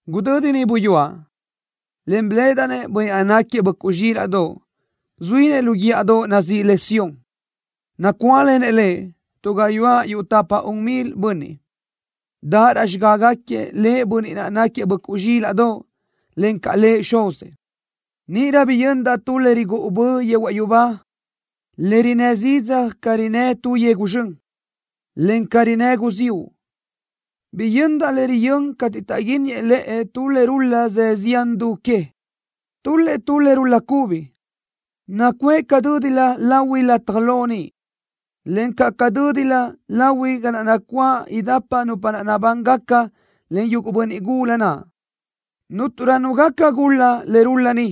Gudödi niʼ buyúaʼ, en biléʼedaʼ-nëʼ Bönniʼ naʼ náquiëʼ Böʼcuʼ Zxílaʼdoʼ zuínëʼ lu guíʼadoʼ nazíʼi le Sión. Nacuáʼlenëʼ Lëʼ tu gayuáʼ yuʼ tapa-un milëʼ bönniʼ, daʼ raʼ xigágaquiëʼ Lëʼ Bönniʼ naʼ náquiëʼ Böʼcuʼ Zxílaʼdoʼ, encaʼ Lëʼ Xuzëʼ. Níʼirö biyöndaʼ tu le rigúʼu bö yehuaʼ yubá, le rinnë́ zidzaj ca rinnë́ tu yegu zxön, en ca rinnë́ guziúʼ. Biyöndaʼ le riyö́n cateʼ taʼguínniëʼ lëʼe tu le rul-la zë zián du que. Tul-lëʼ tu le rul-la cubi, nacuʼë ca dö́dilö lahui lataj lo niʼ, encaʼ ca dö́dilö lahui ga naʼ nacuáʼ idapa nupa naʼ nabángaca len yuguʼ bönniʼ gula naʼ. Cúnturö nu gaca gul-la le rul-la ni,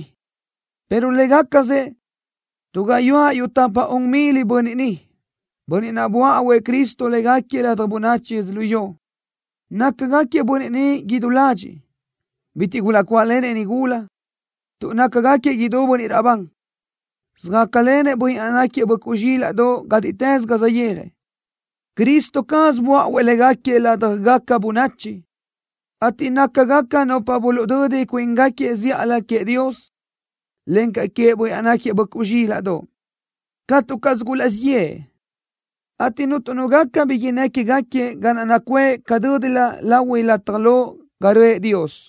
pero légacasëʼ tu gayuáʼ yuʼ tapa-un milëʼ bönniʼ ni, bönniʼ naʼ böáʼuëʼ Cristo légaquiëʼ ladaj bönachi yödzölió. Nácagaquiëʼ bönniʼ ni idú ladxiʼ. Bitiʼ gulaʼcuáʼlenëʼ nigula, tuʼ nácagaquiëʼ idú bönniʼ raʼbán. Söjácalenëʼ Bönniʼ naʼ náquiëʼ Böʼcuʼ Zxílaʼdoʼ gátiʼtës ga saʼyéajëʼ. Cristo caz böáʼuëʼ légaquiëʼ ládjagaca bönachi, ateʼ nácagaca nupa buluʼdödi cuíngaquiëʼ zíʼalö queëʼ Dios, encaʼ queëʼ Bönniʼ naʼ náquiëʼ Böʼcuʼ Zxílaʼdoʼ. Catu caz gulaʼzíʼ yëʼë, ateʼ cuntu nu gaca bi innë́ quégaquiëʼ ga naʼ nacuʼë ca dö́dilö lahui lataj lo ga röʼë Dios.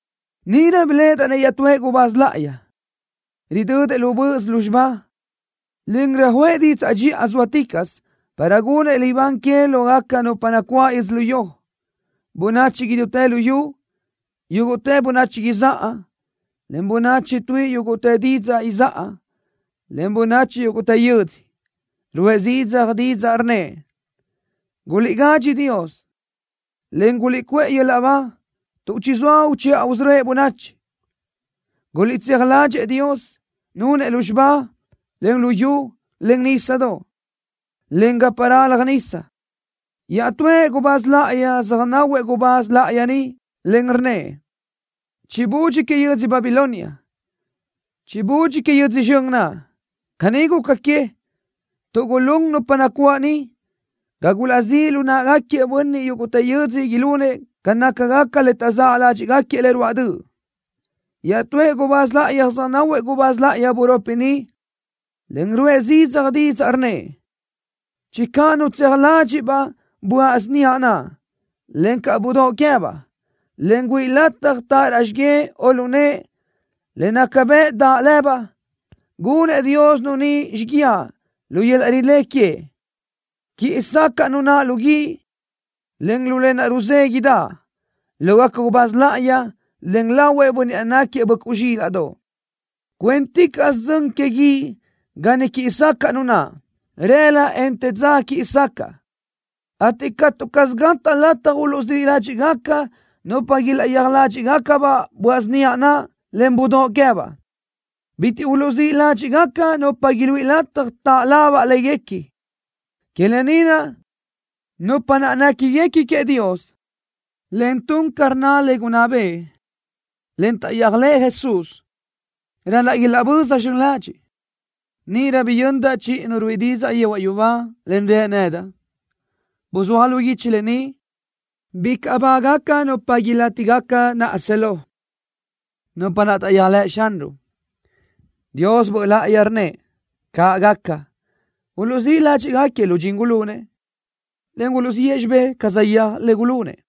Níʼirö biléʼedaʼ iaʼtúëʼ gubáz láʼayi, ridödëʼ lu böʼös lúzxiba, en röjuʼë didzaʼ dxiʼa zóaticaʼsö para gunëʼ libán que lógaca nupa nacuáʼ yödzölió, bönachi idútë luyú, yúguʼtë bönachi izáʼa, en bönachi tuíʼi yúguʼtë didzaʼ izáʼa, en bönachi yúguʼtë yödzö. Ruʼë zidzaj didzaʼ, rnnëʼ: “¡Gulíʼgádxi Dios, en guliʼcuʼë yöl-laʼ ba tuʼ chizóa uchiʼa usörö́ëʼ bönachi! ¡Guliʼtséaj ládxëʼë Dios, nunëʼ lúzxiba, en luyú, en nísadoʼ, en gapa ralaj nisa!” Iaʼtúëʼ gubáz láʼayi söjnáhuëʼ gubáz láʼayi ni, en rnnëʼ: “¡Chibudxi que yödzö Babilonia! ¡Chibudxi que yödzö zxön naʼ! Caní guca que, tuʼ gulún nupa nacuáʼ niʼ ga gulaʼzíʼ lu náʼagaquiëʼ bönniʼ yúguʼtë yödzö ilunëʼ ca nácagaca le taʼzë́ ládxiʼgaquiëʼ le ruáʼ döʼ.” Iaʼtúëʼ gubáz láʼayi söjnáhuëʼ gubáz láʼayi buropi ni, en ruʼë zidzaj didzaʼ, rnnëʼ: “¡Channö nu tseaj ladxiʼ-baʼ böaʼ síniaʼ naʼ, encaʼ budóʼ queë́baʼ, en güíʼi lataj taʼ raʼ xigué o lu nëʼe le naca bëʼ daʼ lëbaʼ, gunëʼ Dios nu ni xíguiaʼ lu yöl-laʼ rilé queëʼ! ¡Quiʼi sacaʼ nu naʼ lu guíʼ, en lu lë naʼ ruzéguiʼdaʼ, lógaca gubáz láʼayi, en lahuëʼ Bönniʼ naʼ náquiëʼ Böʼcuʼ Zxílaʼdoʼ! Cuénticaʼsö dzön que guíʼ ga niʼ quíʼi sacaʼ nu naʼ. Rëla, en te dza quiʼi sacaʼ, ateʼ catu caz gataʼ lataj uluʼzíʼ ládxiʼgaca nupa ilaʼyéaj ládxiʼgaca-baʼ böaʼ síniaʼ naʼ, en budóʼ queë́baʼ. Bitiʼ uluʼzíʼ ládxiʼgaca nupa iluíʼi lataj taʼ labaʼ léguequi. Que lë ni naʼ nupa naʼ néquiguequi queëʼ Dios, en tun ca rnna le gunná bëʼë, en taʼyéajlëʼ Jesús, ral-laʼ ilaʼböza zxön ladxiʼ.” Níʼirö biyöndaʼ chiʼi nu ruíʼi didzaʼ yehuaʼ yubá, en rë nedaʼ: “Buzúaj lu guichi lë ni: ¡Bicaʼ bágaca nupa ilátigaca naʼa si lo, nupa naʼ taʼyéajlëʼ Xanruʼ!” Dios Böʼ Láʼayi rnnëʼ: “¡Caʼ gaca! ¡Uluʼzíʼ ládxiʼgaquiëʼ lu dxin gulunëʼ, en uluʼziʼë xibé ca saʼyéaj le gulunëʼ!”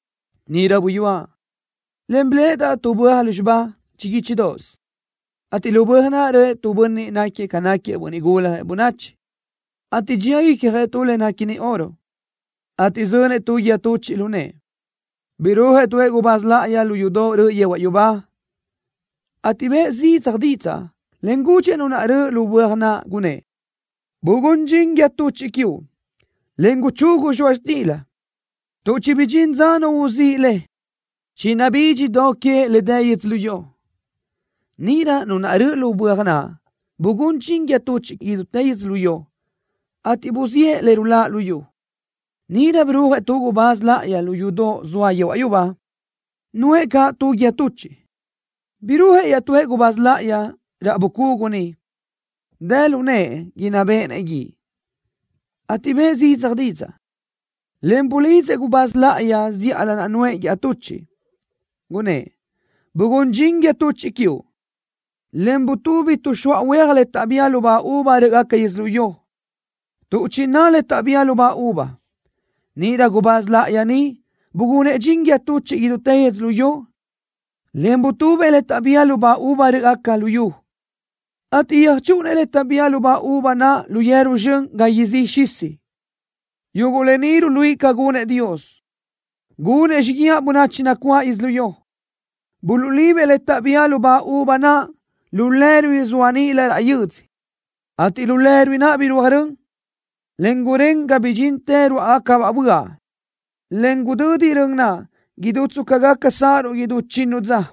Níʼirö buyúaʼ, en biléʼedaʼ tu böaj lúzxiba chiguíchidoʼos, ateʼ lu böaj naʼ röʼë tu bönniʼ náquiëʼ ca náquiëʼ Bönniʼ Guljëʼ Bönachi, ateʼ dxía icjëʼ tu le néquini oro, ateʼ zönëʼ tu guíë tuchiʼ lu nëʼë. Birúajëʼ tuëʼ gubáz láʼayi lu yudoʼ röʼö yehuaʼ yubá, ateʼ bëʼë zidzaj didzaʼ, en gudxëʼ Nu naʼ röʼö lu böaj naʼ, gunnë́ʼ: “¡Bugún dxin guíë tuchiʼ quiuʼ, en guchugu zxoaʼ xtila, tuʼ chibidxín dza nu uzíʼ le! ¡Chinabídx do que le dë yödzölió!” Níʼirö Nu naʼ röʼö lu böaj naʼ bugún dxin guíë tuchiʼ idútë yödzölió, ateʼ buziʼë le ruláʼ luyú. Níʼirö birúajëʼ tu gubáz láʼayi lu yudoʼ zoa yehuaʼ yubá. Nuʼë caʼ tu guíë tuchiʼ. Birúajëʼ iaʼtúëʼ gubáz láʼayi raʼ bucugu niʼ, dë lu nëʼë inná béʼenëʼ guíʼ, ateʼ bëʼë zidzaj didzaʼ, en bulidzëʼ gubáz láʼayi zíʼalö naʼ nuʼë guíë tuchiʼ, gunnë́ʼ: “¡Bugún dxin guíë tuchiʼ quiuʼ, en butubi tuʼxóa huéaj le taʼbía lubá uva rö́ʼgaca yödzölió, tuʼ chiná le taʼbía lubá uva!” Níʼirö gubáz láʼayi ni bugunëʼ dxin guíë tuchiʼ idútë yödzölió, en butubëʼ le taʼbía lubá uva rö́ʼgaca luyú, ateʼ yöjchúʼunëʼ le taʼbía lubá uva naʼ lu yeru zxön ga izí xisi. Yuguʼ lë ni ruluíʼi ca gunëʼ Dios, gunëʼ xíguiaʼ bönachi nacuáʼ yödzölió. Buluʼlibëʼ le taʼbía lubá uva naʼ lu lerui zoa níʼilö raʼ yödzö, ateʼ lu lerui naʼ birúaj rön, en gurén ga bidxintë ruáʼagacabaʼ böaʼ, en gudödi rön naʼ idú tsca gaca sáʼaruʼ idú chinnu dza.